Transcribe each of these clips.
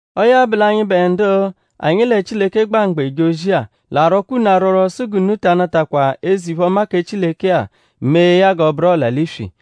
Ọo ya bụ l'anyịbe ndu anyi lẹ Chileke gba mgba eje ozi-a; l'arwọkwa unu arwọrwo sụ g'unu ta anatakwa eze-iphe-ọma kẹ Chileke-a mee ya g'ọ bụru ọla-l'iswi.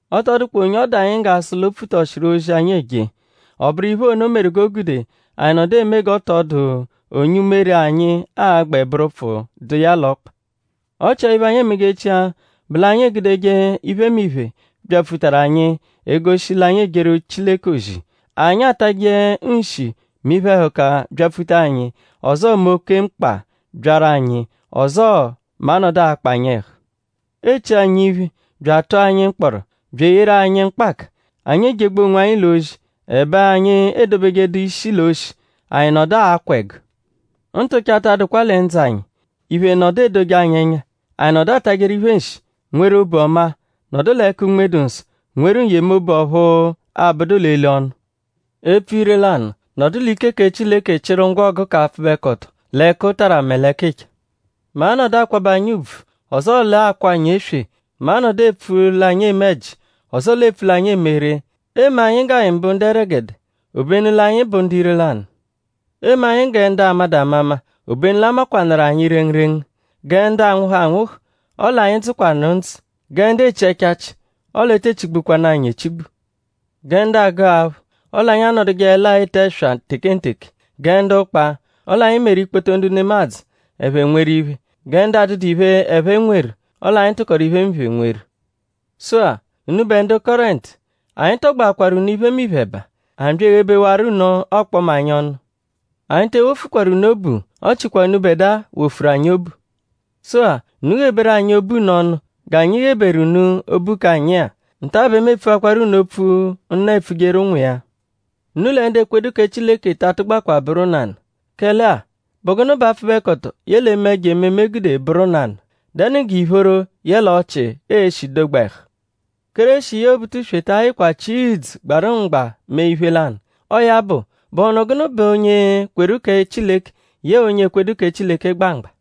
Ọ tọ dụkwa onye ọ dụ anyi g'a sụ l'o pfutọshiru ozi, anyi eje. Ọ bụru iphe ono meru g'o gude anyi nọdu eme g'ọ tọ dụ onye umere anyi a-gbẹ bụru ụpfu dụ iya l'ọkpa. Ọ chia iphe, anyi emejechia bụ l'anyi egudeje iphemiphe, byapfutaru anyi egoshi l'anyi ejeru Chileke ozi. Anyi atajẹ nshi mẹ iphe-ẹhuka -byapfuta anyi; ọzoo mẹ oke mkpa -byaru anyi; ọzoo mẹ a -nọdu akpa anyi ẹhu. Eechi anyi iphe; bya atụ anyi mkpọro; bya eyeru anyi mkpaka. Anyi ejegbu onwanyi l'ozi; ẹbe anyi edobejedu ishi l'oshi; anyi nọdu akwa ẹgu. Ntụcha ta adụkwa lẹ ndzụ anyi; iphe nọdu edoje anyi ẹnya; anyi nọdu atajẹru iphe nshi; nweru obu ọma; nọdu l'ẹka Unme-dụ-Nsọ; nweru n-yemobu ọphu abụdu l'eli-ọnu; epfu ire-lanụ; nọdu l'ike kẹ Chileke chịru ngwọgu k'apfụbekoto l'ẹkutara mẹ l'ẹkicha; mẹ a -nọdu akwabẹ anyi ùbvù; ọzoo l'akwa anyi eswe; mẹ a -nọdu epfu l'anyi eme ẹji; ọzoo l'epfu l'anyi eme ree; eeme anyi g'anyi bụ ndu ẹregede; obenu l'anyi bụ ndu ire-lanụ; eeme anyi gẹ ndu amadụ amama; obenu l'a makwanụru anyi rengurengu; gẹ ndu anwụhu anwụhu; ọle anyi dzụkwanu ndzụ; gẹ ndu echi ẹchachi; ọle e te echigbukwanu anyi echigbu; gẹ ndu agụ aphụ; ọle anyi anọdujeele-a ete ẹswa tekenteke; gẹ ndu ụkpa; ọle anyi meru ikpoto ndu nemadzụ ẹphe nweru iphe; gẹ ndu adụdu iphe, ẹphe nweru; ọle anyi tụkoru iphemiphe, nweru. Sụ-a; unubẹ ndu Kọrentu; anyi tọgboakwaru unu iphemiphe ẹba; anyi bya eghebewaru unu ọkpoma anyi ọnu. Anyi te ewofukwaru unu obu; ọ chikwa unubẹdua wofuru anyi obu. Sụ-a; unu gheberu anyi obu unu ọnu g'anyi gheberu unu obu k'anyi-a. Nta bẹ mu epfuakwaru unu opfu, nna epfujeru ụnwu iya. Unu lẹ ndu ekwedu kẹ Chileke ta atụgbakwa bụru nanụ. Kẹle-a;?bụ gụnu bẹ apfụbekoto yẹle eme ẹjo-ememe gude bụru nanụ??Dẹnu g'ìphóró yẹle ọchii e-shi dogba ẹhu? Kéreshi yẹe Obutuswe ta ayịkwa chịa ìdzù agbarụ mgba mee iphe lanụ. Ọo ya bụ;?bụhunu gụnu bẹ onye kweru kẹ Chileke yẹe onye ekwedu kẹ Chileke gba mgba?